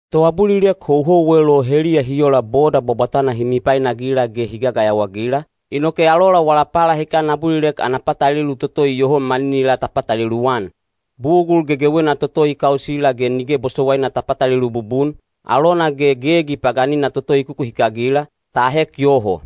Toabulilek houhouwel o heliya hi ola boda bwabwatana hi mipainagila ge hi gayawaagila, inoke alola wala palahikan abulilek ana patalelu toto iyoho maninilaa ta patalelu-an. Bugul gegewena toto i kausila ge nige bosowaina ta patalelu bubun, alona ge gegi paganina toto i kukuhikagila, ta ahek yoho.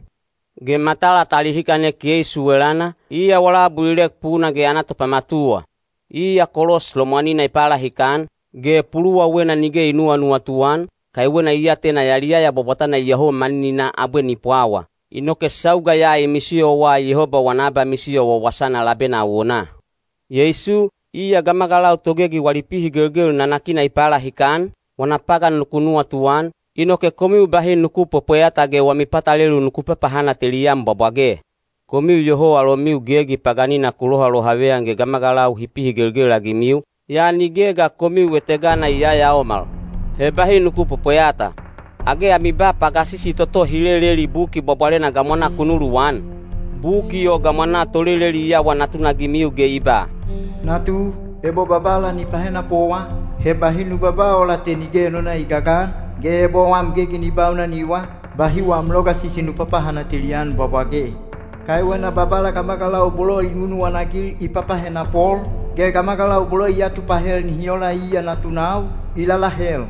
Ge matala ta lihikanek Yeisu elana, iya wala abulilek puna ge ana topamatuwa. Iya kolos lomwanina i palahikan, ge puluwawena nige i nuwanuwatu-an, kaiwena i atena yaliyaya bwabwatana iyoho manininaa abwe ni pwawa. Inoke sauga ya i misiyowa Yehoba wana abamisiyo wawasana labena awonaa. Yeisu, iya gamagalau togegi wali pihigelgel nanakina i palahikan, wana pagan nuku nuwatuan, inoke komiu bahi nuku pwepweyata ge wami patalelu nuku papahanateli-an bwabwage. Komiu iyoho alomiu gegi paganina ku lohalohaveyan ge gamagalau hi pihigelgel-agimiu, yaa nige ga komiu etegana i yayaomal. He bahi nuku pwepweyata. Age ami ba pagasisi toto hi leleli Buki Bwabwalena gamwanaa ku nuluwan? Buki o gamwanaa toleleli i awa natunagimiu ge i ba: Natu, ebo Babala ni pahenapowa, he bahi nu babaa ola te nige enona i gagan, ge ebo wam gegi ni baunaniwa, bahi wam logasisi nu papahanateli-an bwabwage. Kaiwena Babala gamagalau bolo i nunuwana-agil i papahenapol, ge gamagalau bolo i atupahel nihi ola iya natunau, i lalahel.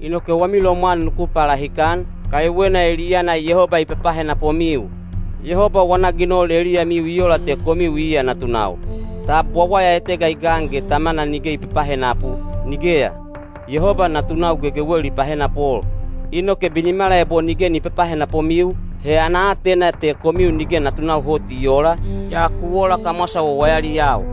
Inoke wami lomwan nuku palahikan, kaiwena eliyana Yehoba i papahenapomiu. Yehoba wana ginol eliyamiu i ola te komiu iya natunau. Tab wawaya etega i gan ge tamana nige ni papahenapu? Nigeya. Yehoba natunau gegewel i pahenapol. Inoke binimala ebo nige ni papahenapomiu, he ana aatena te komiu nige natunau hot i oola, yaa ku ola kamwasa wawayaliyau.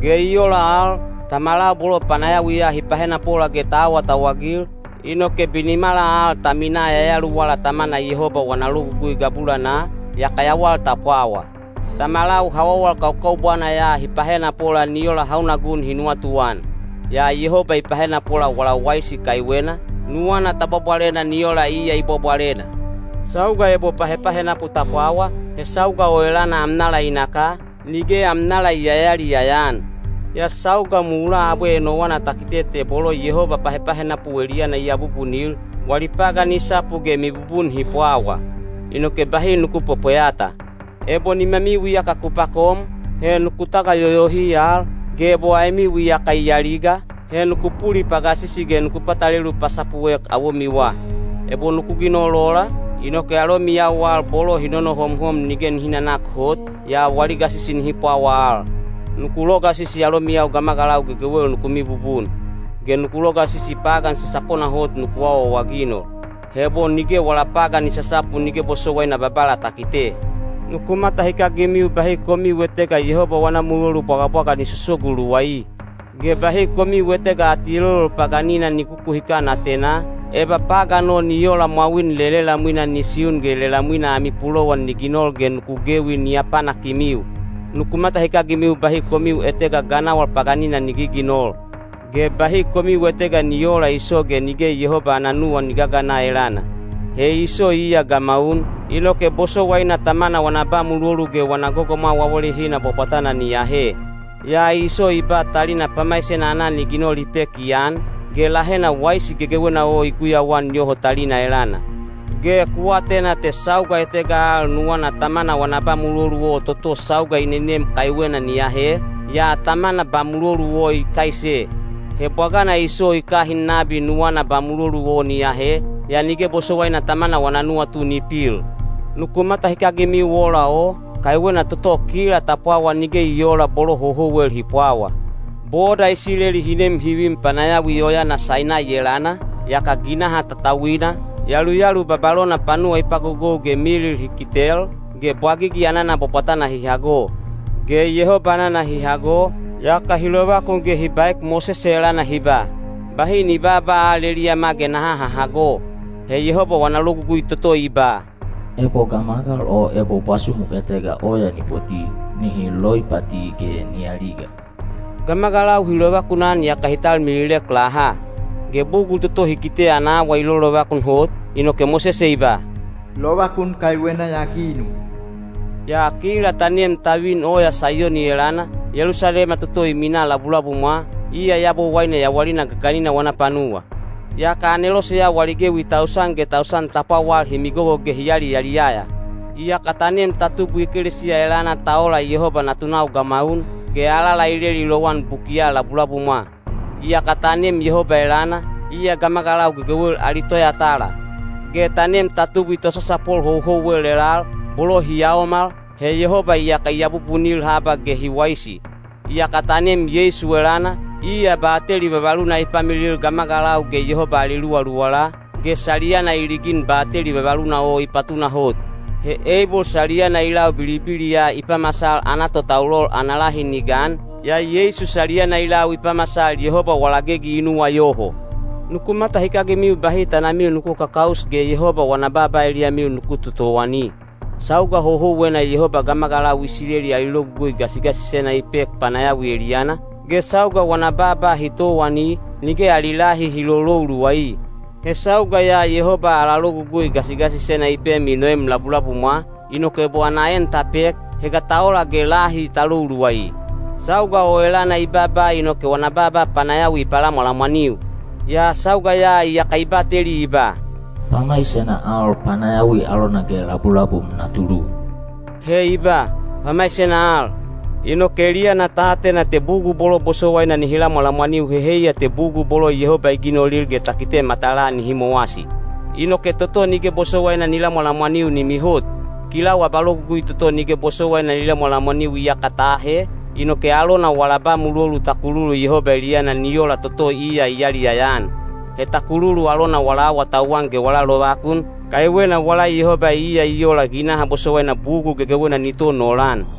Ge i ola al, tamalau bolo panayawiya hi pahenapola ge ta awatauwagil, inoke binimala al ta minaa yayaluwala Tamana Yehoba wana logugui gabulanaa, yaka yawal ta pwawa. Tamalau hawawal kaukaubwana ya hi pahenapola ni ola hauna gun hi nuwatuan; yaa Yehoba i pahenapola wala waisi kaiwena, nuwana ta bwabwalena ni ola iya i bwabwalena. Sauga ebo pahepahenapu ta pwawa, he sauga o elana amnala i naka, nige amnala i yayaliyaya-an. Yaa sauga mulaa abwe enowana ta kite te bolo Yehoba pahepahenapu o eliyana i abubunil, wali pagan i sapu ge mibubun hi pwawa. Inoke bahi nuku pwepweyata. Ebo nimamiu iyaka ku pakom, he nuku tagayoyohi al, ge ebo aemiu iyaka i aliga, he nuku pulipagasisi ge nuku patalelu pasapuek awomiwa. Ebo nuku ginol ola, inoke alomiyau al bolo hi nonohomhom nige nihi nanak hot, yaa wali gasisi nihi pwawa al. Nuku logasisi alomiyau gamagalau gegewel nuku mibubun. Ge nuku logasisi pagan sasapona hot nuku awaawaginol. He ebo nige wala pagan i sasapu nige bosowaina Babala ta kite. Nuku matahikagimiu bahi komiu etega Yehoba wana mulolu bwagabwaga ni sosogu luwai. Ge bahi komiu etega atielolol paganina ni kukuhikan atenaa, eba pagan o ni ola mwawin lelelamwina ni siun ge lelamwina ami pulowan ni ginol ge nuku gewi ni apanakimiu. Nuku matahikagimiu bahi komiu etega ganawal paganina ni giginol. Ge bahi komiu etega ni oola Iso ge nige Yehoba ana nuwan ni gagana elana. He Iso iya gamaun, inoke bosowaina tamana wana ba mulolu ge wana gogomwau awalehina bwabwatana ni ahe. Yaa Iso i ba talina pamaisena aanan i ginol i pek i an, ge lahena waisi gegewena o i guyauan yoho talina elana. Ge ku atena te sauga etega al nuwana tamana wana ba mulolu o toto sauga i nenem kaiwena ni ahe, yaa tamana ba mulolu o i kaise. He bwagana Iso i kahin nabi nuwana ba mulolu o ni ahe, yaa nige bosowaina tamana wana nuwatu ni pil. Nuku matahikagimiu ola o, kaiwena toto kila ta pwawa nige i oola bolo houhouwel hi pwawa. Boda Isileli hi nem hi vin panayawi oyana Sainai elana, yaka ginaha tatauina, yaluyalu babalona panuwa i pagogou ge milil hi kitel, ge bwagigi anana bwabwatana hi hago. Ge Yehoba anana hi hago, yaka hi lovakun ge hi baek Mosese elana hi ba, “Bahi ni baaba al eliyama ge naha hahago.” He Yehoba wana logugui toto i ba, “Ebo gamagal o ebo bwasumu etega oya ni poti, nihi loipati ge ni aliga,” gamagalau hi lovakunan yaka hi talmililek laha. Ge bugul toto hi kite ana awa i lolovakun hot, inoke Mosese i ba, “Lovakun kaiwena ya ginu.” Yaa kila ta nem ta vin oya Saiyoni elana, Yelusalema toto i minaa labulabumwa, iya Yabowaine yawalina gaganina wana panuwa. Yaka aneloseyau ali gewi tausan ge tausan ta pwawal hi migogo ge hi yaliyaliyaya. Iyaka ta nem ta tubwi ekelesiya elana ta ola Yehoba natunau gamaun, ge alala i leli lowan bukiya labulabumwa. Iyaka ta nem Yehoba elana, iya gamagalau gegewel ali toyatala. Ge ta nem ta tubwi tosasapol houhouwel elal, bolo hi yaomal, he Yehoba iyaka i abubunil haba ge hi waisi. Iyaka ta nem Yeisu elana, iya bateli vavaluna i pamilil gamagalau ge Yehoba ali luwaluwala, ge saliyana i ligin bateli vavaluna o i patunahot. He Eibol saliyana i lau bilibiliya i pamasal ana totaulol ana lahi ni gan, yaa Yeisu saliyana i lau i pamasal Yehoba wala gegi i nuwayoho. Nuku matahikagimiu bahi tanamiu nuku kakaus ge Yehoba wana baaba eliyamiu nuku totowani. Sauga houhouwena Yehoba gamagalau Isileli ali logugui gasigasisena i pek panayawi eliyana, ge sauga wana baaba hi towani, nige ali lahi hi lolou luwai. He sauga ya Yehoba ala logugui gasigasisena i pem i noem labulabumwa, inoke ebo ana en ta pek, he ga ta ola ge lahi ta lou luwai? Sauga o elana i baaba inoke wana baaba panayawi i palamwalamwaniu. Yaa sauga ya iyaka i bateli i ba, “Pamaisena al panayawi alona ge labulabum na tulu.” He i ba, “Pamaisena al,” inoke eliyana ta atena te bugul bolo bosowaina nihi lamwalamwaniu—he heiya te bugul bolo Yehoba i ginolil ge ta kitel matalaa—nihi mowasi. Inoke toto nige bosowaina ni lamwalamwaniu ni mihot. Kilau abalogugui toto nige bosowaina ni lamwalamwaniu iyaka ta ahe, inoke alona wala ba mulolu ta kululu Yehoba eliyana ni ola toto iya i yaliyaya-an. He ta kululu alona wala awatauwan ge wala lovakun, kaiwena wala Yehoba iya i ola ginaha bosowaina bugul gegewena ni ton olan.